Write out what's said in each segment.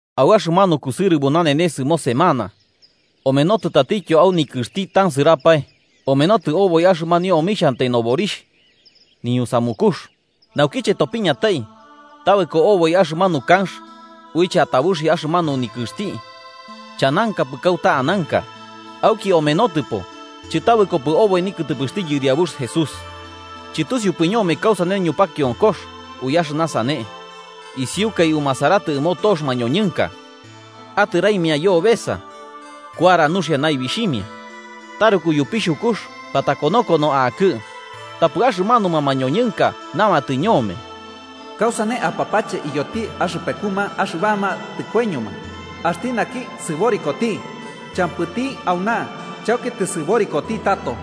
Au axɨmanu kusɨrɨbo nanenes ɨmo semana omenotɨ tatityo au nikɨxti tansɨrapae, omenotɨ oboi axɨmanio omixhantai noborixh niñusamukux. Naukiche topiñatai, tabɨko oboi axɨmanu kanx uiche atabuxi axɨmanu nikɨxti chanankapɨ kauta ananka. Auki omenotɨpo, chɨtabɨkopɨ oboi nikɨtɨpɨxti Yɨriabux Jesús. Chɨtusiupɨ ñome kausane ñupakionkox ui axɨna sane, isiukai umasaratɨ ɨmo tox mañoñɨnka atɨraimia yobesa, kuara nuxia naibixhimia. Taruku yupixhukux, patakonokono akɨ. Tapɨ axɨmanuma mañoñɨnka namatɨ ñome: –¿Kausane apapache iyoti axɨpekuma axɨbama tɨkoiñoma axti naki sɨborikoti? Champɨti auna, chauki tɨsɨborikoti tato.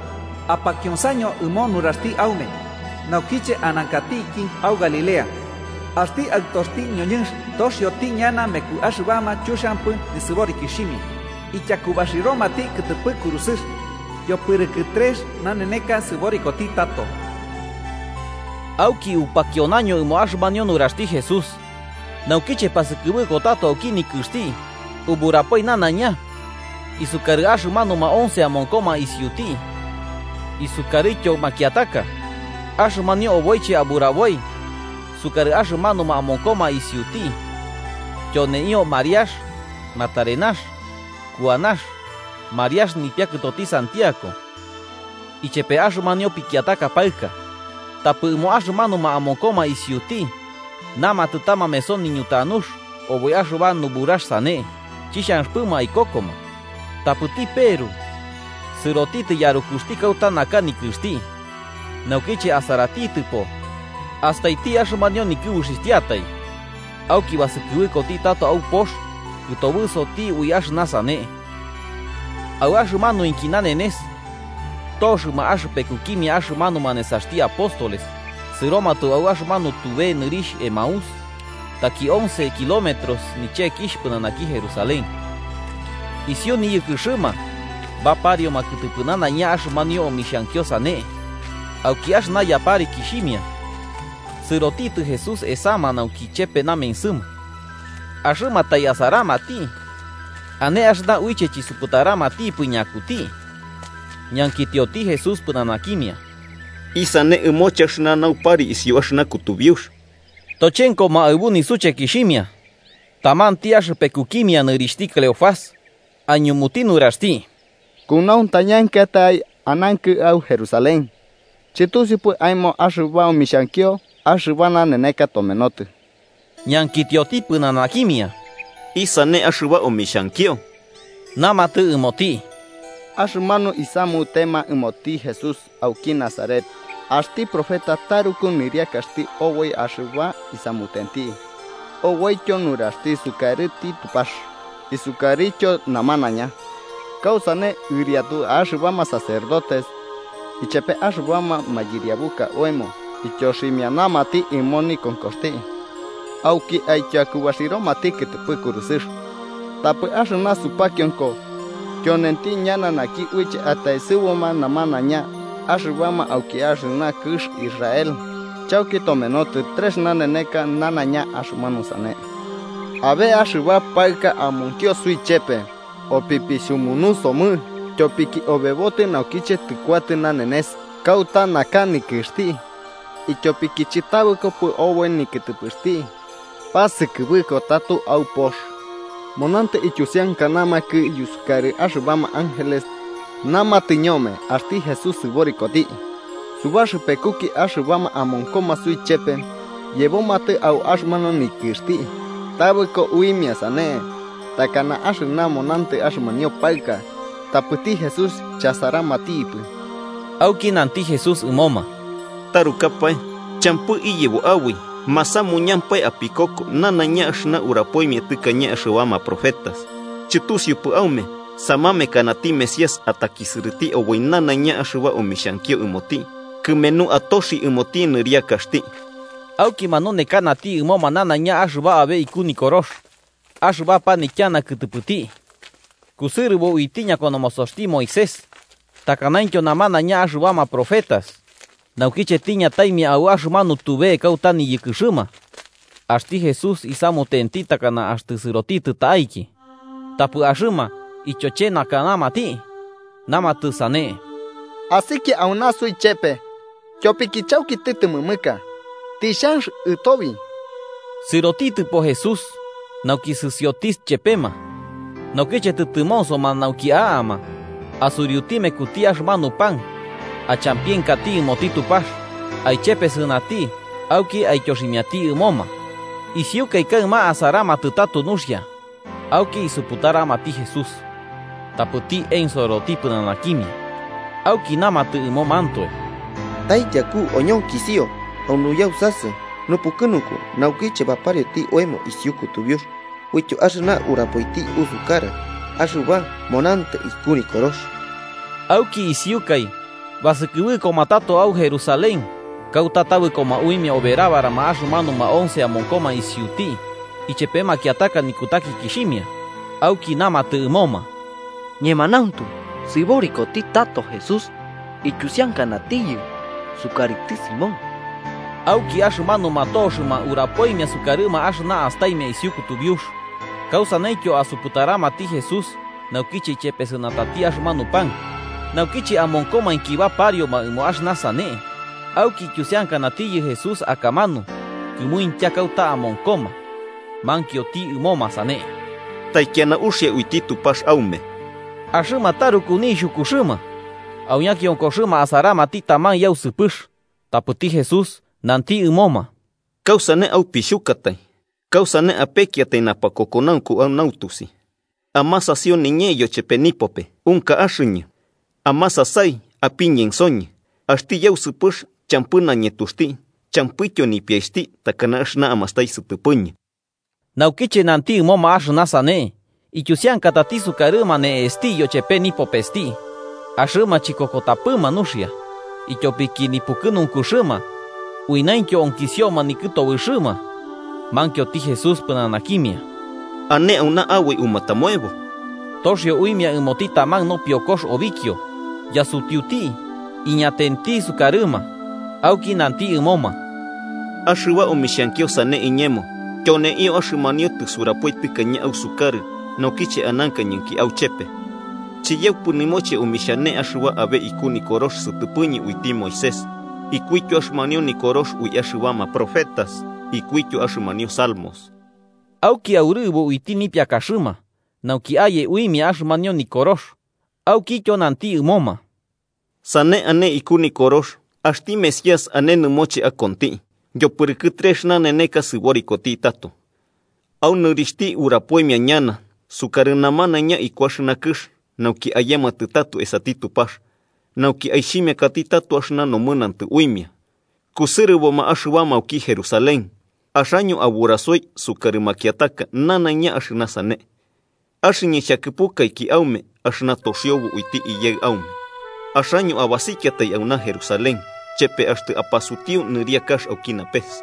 Apakionsaño ɨmo nuraxti aume naukiche anankatiki au Galilea: axti Aɨtoxti ñoñɨnx toxioti ñana meku axɨbama chuxiampɨ nisɨborikixhimia, ityakubaxiromati kɨtɨpɨ kurusɨx yopɨrɨkɨ trex naneneka sɨborikoti tato. Auki upakionaño ɨmo axɨmanio nuraxti Jesús, naukiche pasɨkɨbɨko tato auki nikɨxti uburapoi nanaiña isukarɨ axɨmanuma once amonkoma isiuti isukarɨtyo makiataka. Axɨmanio oboiche aburaboi sukarɨ axɨmanuma amonkoma isiuti tyoneio Mariax Magdalena, Kuanax, Mariax nipiakɨtoti Santiago, ichepe axɨmanio pikiataka paɨka. Tapɨ ɨmo axɨmanuma amonkoma isiuti namatɨ ta mameso niñutanux oboi axɨba nuburax sane, chixhanxɨpɨma aikokoma. Tapɨti Peru, sɨrotitɨ yarukuxti kauta naka nikɨxti. Naukiche asaratitɨpo, astaiti axɨmanio nikɨbuxixhtiai. Auki basɨkɨbɨkoti tato au pox, kɨtobɨsoti ui axɨna sane. Au axɨmanuinki nanenes, toxɨma axɨpekukimia axɨmanuma nesaxti apóstoles sɨromatɨ au axɨmanu tube nɨrixh Emaús, taki once kilómetros nichekixh pɨnanaki Jerusalén. Isiu niyɨkɨxɨma baparioma kɨtɨpɨ nanaiña axɨmanio omixhankio sane. Auki axɨna yaparikixhimia, sɨrotitɨ Jesús esama nauki chepe namensɨma. Axɨma tai asaramati, ane axɨna uiche chisuputaramatipɨ ñakuti. Ñankitioti Jesús pɨnanakimia: –¿Isane ɨmoche axɨna naupari isiu axɨna kutubiux? Tochenkoma aɨbu nisuchekixhimia, tamanti axɨpekukimia, nɨrixhti Cleofás, aiñumuti nuraxti: –¿Kunauntañankɨatai anankɨ au Jerusalén chɨtusiupɨ aemo axɨba omixhankio axɨba naneneka tomenotɨ? Ñankitioti pɨnanakimia: –¿Isane axɨba omixhankio? Namatɨ ɨmoti: –Axɨmanu isamutema ɨmoti Jesús auki Nazaret, axti profeta taruku nɨriakaxti oboi axɨba isamutenti oboityo nuraxti sukarɨti Tupax isukarɨtyo namanaiña. Kausane ɨriatu axɨbama sacerdotes ichepe axɨbama mayɨriabuka oemo ityoximianamati ɨmo nikonkoxti auki aityakubaxiromati kɨtɨpɨ kurusɨx. Tapɨ au axɨna supakionko tyonenti ñana naki uiche ataesɨbuma namanaiña axɨbama auki axɨna kɨx Israel. Chauki tomenotɨ trex naneneka nanaiña axɨmanu sane. Abe axɨba paɨka amonkio suichepe opipixhumunusomɨ, tyopiki obebotɨ naukiche tɨkuatɨ nanenes kauta naka nikɨxti, ityopiki chɨtabɨkopɨ oboi nikɨtɨpɨxti, pasɨkɨbɨko tato au pox. Monantɨ ityusiankanamakɨ yusukarɨ axɨbama ángeles namatɨ ñome axti Jesús sɨborikoti. Subaxɨpekuki axɨbama amonkoma suichepe yebomatɨ au axɨmanu nikɨxti tabɨko uimia sane takana axɨna monantɨ axɨmanio paɨka, tapɨti Jesús chasaramatipɨ. Auki nanti Jesús ɨmoma: –¡Tarukapae champɨ iyebo aboi masamuñampae apikoko nanaiña axɨna urapoimia tɨkañe axɨbama profetas! ¿Chɨtusiupɨ aume samamekanati Mesías atakisɨrɨti oboi nanaiña axɨba omixhankio ɨmoti kɨmenu atoxi ɨmoti nɨriakaxti? Auki manunekanati ɨmoma nanaiña axɨba abe iku Nikorox axɨba panityana kɨtɨpɨti, kɨsɨrɨbo uiti ñakonomosoxti Moisés takanaintyo namanaiña axɨbama profetas. Naukiche tiñataimia au axɨmanu tube kauta niyɨkɨxɨma, axti Jesús isamutenti takana axtɨ sɨrotitɨ ta'aiki. Tapɨ axɨma ityochenakanamati, namatɨ sane: –Asikia auna suichepe, tyopiki chauki tɨtɨmɨmɨka. Tixhanx ɨtobi. Sɨrotitɨpo Jesús nauki sɨsioti chepema. Naukiche tɨtɨmonsoma nauki a'ama, asuriuti mekuti axɨmanu pan, achampienkati ɨmoti Tupax, aichepesɨnati auki aityoximiati ɨmoma. Isiukai kaɨma asaramatɨ tato nuxia auki isuputaramati Jesús. Tapɨti ensoroti pɨnanakimia. Auki namatɨ ɨmomantoe: –¿Taityaku oñonkisio au nuyausasɨ nupukɨnunku naukiche baparioti oemo isiu kutubiux uityo axɨna urapoiti usukarɨ axɨba monantɨ iku Nikorox? Auki isiukai, basɨkɨbɨkoma tato au Jerusalén, kauta tabɨkoma uimia oberabarama axɨmanuma once amonkoma isiuti ichepe makiataka nikutakikixhimia, auki namatɨ ɨmoma: –Ñemanauntu sɨborikoti tato Jesús, ityusiankanatiyɨ sukarɨti Simón. Auki axɨmanuma toxɨma urapoimia sukarɨma axɨna astaimia isiu kutubiux, kausaneityo asuputaramati Jesús naukiche ichepesɨnatati axɨmanu pan. Naukiche amonkomainki baparioma ɨmo axɨna sane, auki ityusiankanatiyɨ Jesús akamanu kɨmuintya kauta amonkoma mankioti ɨmoma sane: –Taikiana uxia uiti Tupax aume. Axɨma taruku nixhukuxɨma, au ñakionkoxɨma asaramati taman yausɨpɨx. Tapɨti Jesús nanti ɨmoma: –¿Kausane aupixhukatai? ¿Kausane apekiatai napakokonaunku au nautusi? Amasasio niñee yochepe nipope. Unka axɨñɨ. Amasasai apiñensoñɨ: axti yausɨpɨx champɨ nañetuxti champɨityo nipiaixhti, takana axɨna amastai sɨtɨpɨñɨ. Naukiche nanti ɨmoma axɨna sane, ityusiankatati sukarɨma ne'esti yochepe nipopesti. Axɨma chikokoromatipɨ nuxia, ityopiki nipukɨnunkuxɨma uinaintyo onkisioma nikɨtobɨxɨma, mankioti Jesús pɨnanakimia: –¿Ane auna aboi umatamoebo? Toxio uimia ɨmoti taman nopiokox obikio, yasutiuti iñatenti sukarɨma. Auki nanti ɨmoma: –Axɨba omixhankio sane iñemo tyoneio axɨmanio tɨsurapoi tɨkañe ausukarɨ naukiche anankañɨnki auchepe: chiyaupɨ nɨmoche omixhane axɨba abe iku Nikorox sɨtɨpɨñɨ uiti Moisés, ikuityo axɨmanio Nikorox ui axɨbama profetas ikuityo axɨmanio Salmos. Auki aurɨbo uiti nipiakaxɨma nauki aye uimia axɨmanio Nikorox, aukityo nanti ɨmoma: –Sane ane iku nikorox axti Mesías ane nɨmoche akonti, yopɨrɨkɨ trex naneneka sɨborikoti tato, au nɨrixhti urapoimia ñana sukarɨ namanaiña iku axɨna kɨx nauki ayematɨ tato esati Tupax, nauki aixhimiakati tato axɨna nomɨnantɨ uimia. Kusɨrɨboma axɨbama auki Jerusalén, axaño aburasoi sukarɨ makiataka nanaiña axɨna sane. Axɨñɨ xhakɨpukaiki aume axɨna toxiobo uiti Iyaɨ aume, axaño abasikiatai, auna Jerusalén, chepe axtɨ apasutiu nɨriakax auki napes.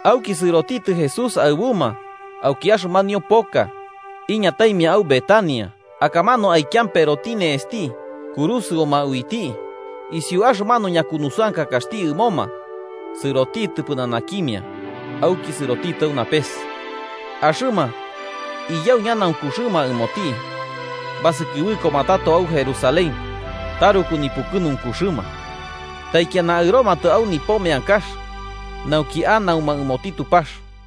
Auki sɨrotitɨ Jesús aɨbuma auki axɨmanio poka, iñataimia au Betania, akamanu aikiamperoti ne'esti kurusɨuma uiti. Isiu axɨmanu ñakunusɨankakaxti ɨmoma, sɨrotitɨ pɨnanakimia auki sɨrotitɨ au napes. Axɨma, iyau ñanaunkuxɨma ɨmoti, basɨkɨbɨkoma tato au Jerusalén taruku nipukɨnunkuxɨma. Taikiana aɨromatɨ au nipo meankax, nauki anauma ɨmoti Tupax.